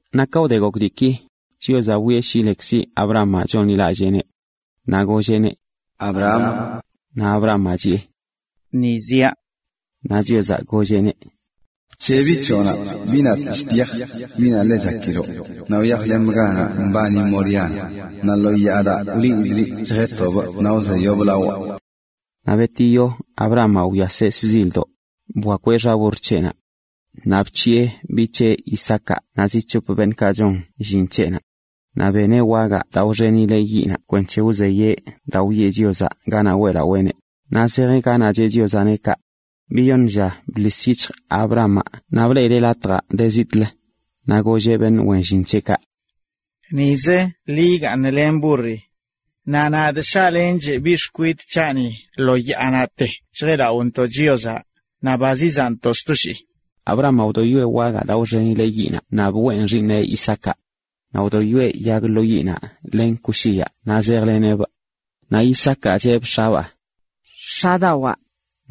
Naꞌ ka wde gok diiki, Chiozaꞌ bwieꞌ shi lekzi Abrahamaꞌ chonḻilalleeneꞌ. Naꞌ golleꞌneꞌ: ―Abraham. Naꞌ Abrahamaꞌ chiꞌe: ―Ni ziaꞌ. Naꞌ Chiozaꞌ golleꞌneꞌ: ―Bc̱heꞌ biꞌ c̱hoꞌnaꞌ tlishꞌ tyaj, biꞌnaꞌ ḻe chakiloꞌ, naꞌ wyajlemꞌ ganaꞌ mbani Moríanaꞌ, naꞌ lo yaa daa wliidꞌ liꞌ lljetoꞌbꞌ naꞌ wzeyoꞌbꞌ lawaꞌ. Naꞌ betiyo Abrahamaꞌ wyaseꞌ shzildoꞌ, bwakweꞌ xa burr c̱heꞌnaꞌ. Naꞌ bc̱hiꞌe biꞌ c̱heꞌ Isaacaꞌ naꞌ zi c̱hop beṉꞌkaꞌ chon llin c̱heꞌnaꞌ. Naꞌ beneꞌ wagaꞌ daa wxenileꞌ yiꞌnaꞌ kwenc̱he wzeyeꞌ daa wiꞌe Chiozaꞌ ganaꞌ weꞌlaꞌoweꞌneꞌ, naꞌ zejeꞌ ganaꞌ cheꞌ Chiozaꞌneꞌ kaꞌ. Biyoṉ lla bḻis yic̱hj Abrahamaꞌ naꞌ bleꞌileꞌ latjaꞌ de zitꞌlə. Naꞌ golleꞌ beṉꞌ wen llin c̱heꞌkaꞌ: ―Nizə ḻi yigaaṉ len burri. Naꞌ nadꞌ shaꞌlench biꞌ xkwidꞌ c̱haꞌni lo yaa naꞌte lljeꞌlaꞌontoꞌ Chiozaꞌ, naꞌ ba zizaꞌntoꞌ sto shii. Abrahamaꞌ wdoyoeꞌ wagaꞌ daa wxenileꞌ yiꞌnaꞌ naꞌ bween xiiṉeꞌ Isaacaꞌ. Naꞌ wdoyoeꞌ yag lo yiꞌnaꞌ len kushiyaꞌ naꞌ zejleneꞌbꞌ. Naꞌ Isaacaꞌ cheꞌbꞌ x̱abaa: ―X̱adawaa.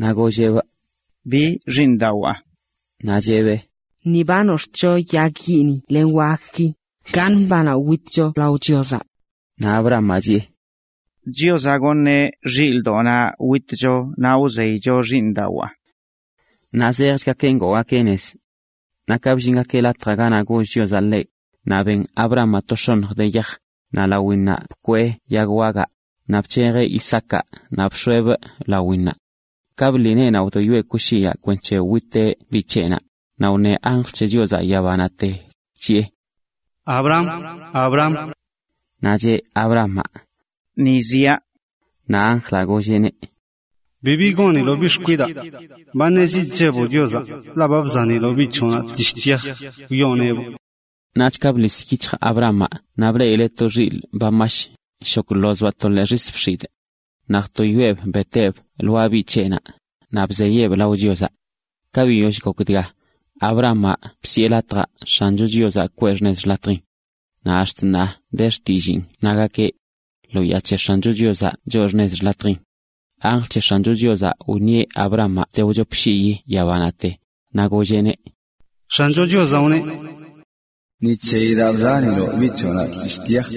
Naꞌ golleꞌbꞌ: ―¿Bi xiiṉdawaa? Naꞌ cheꞌbee: ―Ni ba nox̱ꞌcho yag yiꞌni len wagui, ¿gaṉ banaꞌ witcho lao Chiozaꞌ? Naꞌ Abrahamaꞌ chiꞌe: ―Chiozaꞌ goṉeꞌ xilꞌdoꞌnaꞌ witcho, xiiṉdawaa. Naꞌ zejchgakeꞌ ngoogakeꞌ nez. Naꞌ ka bllingakeꞌ latj ganaꞌ goll Chiozaꞌ ḻeꞌ, naꞌ ben Abrahamaꞌ to x̱oṉj de yaj, naꞌ lawinnaꞌ bkwee yag wagaꞌ, naꞌ bc̱hejeꞌ Isaacaꞌ naꞌ bx̱oeꞌbꞌ lawinnaꞌ. Ka bḻi neenaꞌ wdoyoeꞌ kushiyaꞌ kwenc̱he witeꞌ biꞌ c̱heꞌnaꞌ, naꞌ wṉe anjl c̱he Chiozaꞌ yabanaꞌte, chiꞌe: ―¡Abraham! ¡Abraham! Naꞌ cheꞌ Abrahamaꞌ: ―Ni ziaꞌ. Naꞌ anjlaꞌ golleꞌneꞌ: ―Bibi goniloꞌ biꞌ xkwidaa. Ba ṉezidꞌ chlleboꞌ Chiozaꞌ, ḻaꞌ ba bzaniloꞌ biꞌ c̱hoꞌnaꞌ tlishꞌ tyaj, wiꞌoneꞌbꞌ. Naꞌch ka bḻis yic̱hj Abrahamaꞌ naꞌ bleꞌileꞌ to xilꞌ, ba mash, nshok ḻozbaꞌ to ḻee xis bx̱idꞌ. Naꞌ jtoyoꞌeb beteꞌb lwaa biꞌ c̱heꞌnaꞌ, naꞌ bzeyeꞌb lao Chiozaꞌ. Ka biyoll gok dga, Abrahamaꞌ bsiꞌe latjaꞌ: “X̱ancho Chiozaꞌ kwee xṉez xḻatjin.” Naꞌ ax̱t ṉaa de xtilliin, nagakeꞌ: “Lo yaa c̱he X̱ancho Chiozaꞌ choo xṉez xḻatjin.” Anjl c̱he X̱ancho Chiozaꞌ wṉieꞌ Abrahamaꞌ de wchop shii() yabanaꞌte, naꞌ golleꞌneꞌ: ―X̱ancho Chiozaꞌ wneꞌ: “Ni c̱heyi daa bzaniloꞌ biꞌ c̱hoꞌnaꞌ tlishꞌ tyaj,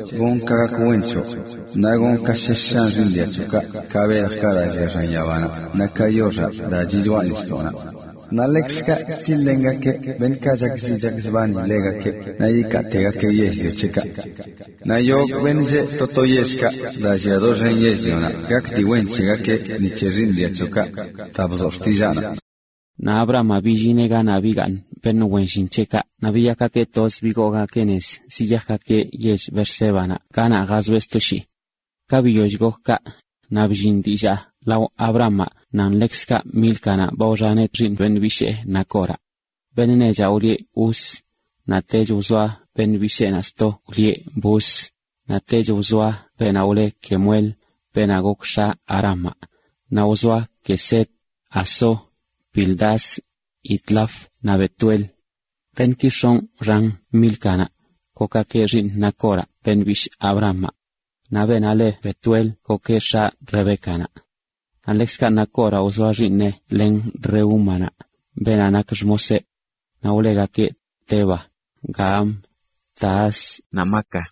gonꞌ ka gak wen c̱hoꞌ, naꞌ gonꞌ ka shesh shan xiiṉ dia c̱hoꞌkaꞌ ka beljkaꞌ daa llia xan yabanaꞌ naꞌ ka yoxaꞌ daa chiꞌ choꞌa nisdoꞌnaꞌ, naꞌ ḻekzkaꞌ tiḻ-lengakeꞌ beṉꞌkaꞌ chakziꞌ chakzbani ḻegakeꞌ naꞌ ikaategakeꞌ yell-lio c̱heꞌkaꞌ. Naꞌ yogꞌ beṉꞌ lleꞌ to to yellkaꞌ daa llia doxen yell-lioni gak dii wen c̱hegakeꞌ ni c̱he xiiṉ dia c̱hoꞌkaꞌ, daa bzoꞌ xtillaanaꞌ.” Naꞌ Abrahamaꞌ billineꞌ ganaꞌ bigaaṉ beṉꞌ wen llin c̱heꞌkaꞌ naꞌ biyakgakeꞌ toz, bigoogakeꞌ nez zjayaakeꞌ yell Beersébanaꞌ ganaꞌ jazoeꞌ sto shii. Ka biyoll gok kaꞌ, naꞌ bllin dillaa lao Abrahamaꞌ nan ḻekzkaꞌ Mílcanaꞌ ba wxaneꞌ biꞌ c̱he beṉꞌ bishee, Nacoraꞌ. Beṉꞌ nechaꞌ wlieꞌ Uz, naꞌtech wzoa beṉꞌ bisheenaꞌ sto wlieꞌ Buz, naꞌtech wzoa beenaꞌ wle Kemuel, beenaꞌ gok x̱a Aramaꞌ; naꞌ wzoa Quesed, Hazo, Pildas, Jidlaf naꞌ Betuel. Beṉꞌki x̱onꞌ wxan Mílcanaꞌ, gokgakeꞌ xiiṉ Nacoraꞌ beṉꞌ bishꞌ Abrahamaꞌ. Naꞌ beenaꞌ leꞌ Betuel gokeꞌ x̱a Rebécanaꞌ. Naꞌ ḻekzkaꞌ Nacoraꞌ wzoa xiiṉeꞌ len Reúmanaꞌ, beenaꞌ nak xmoseꞌ. Naꞌ wlegakeꞌ Teba, Gaham, Tahas naꞌ Maaca.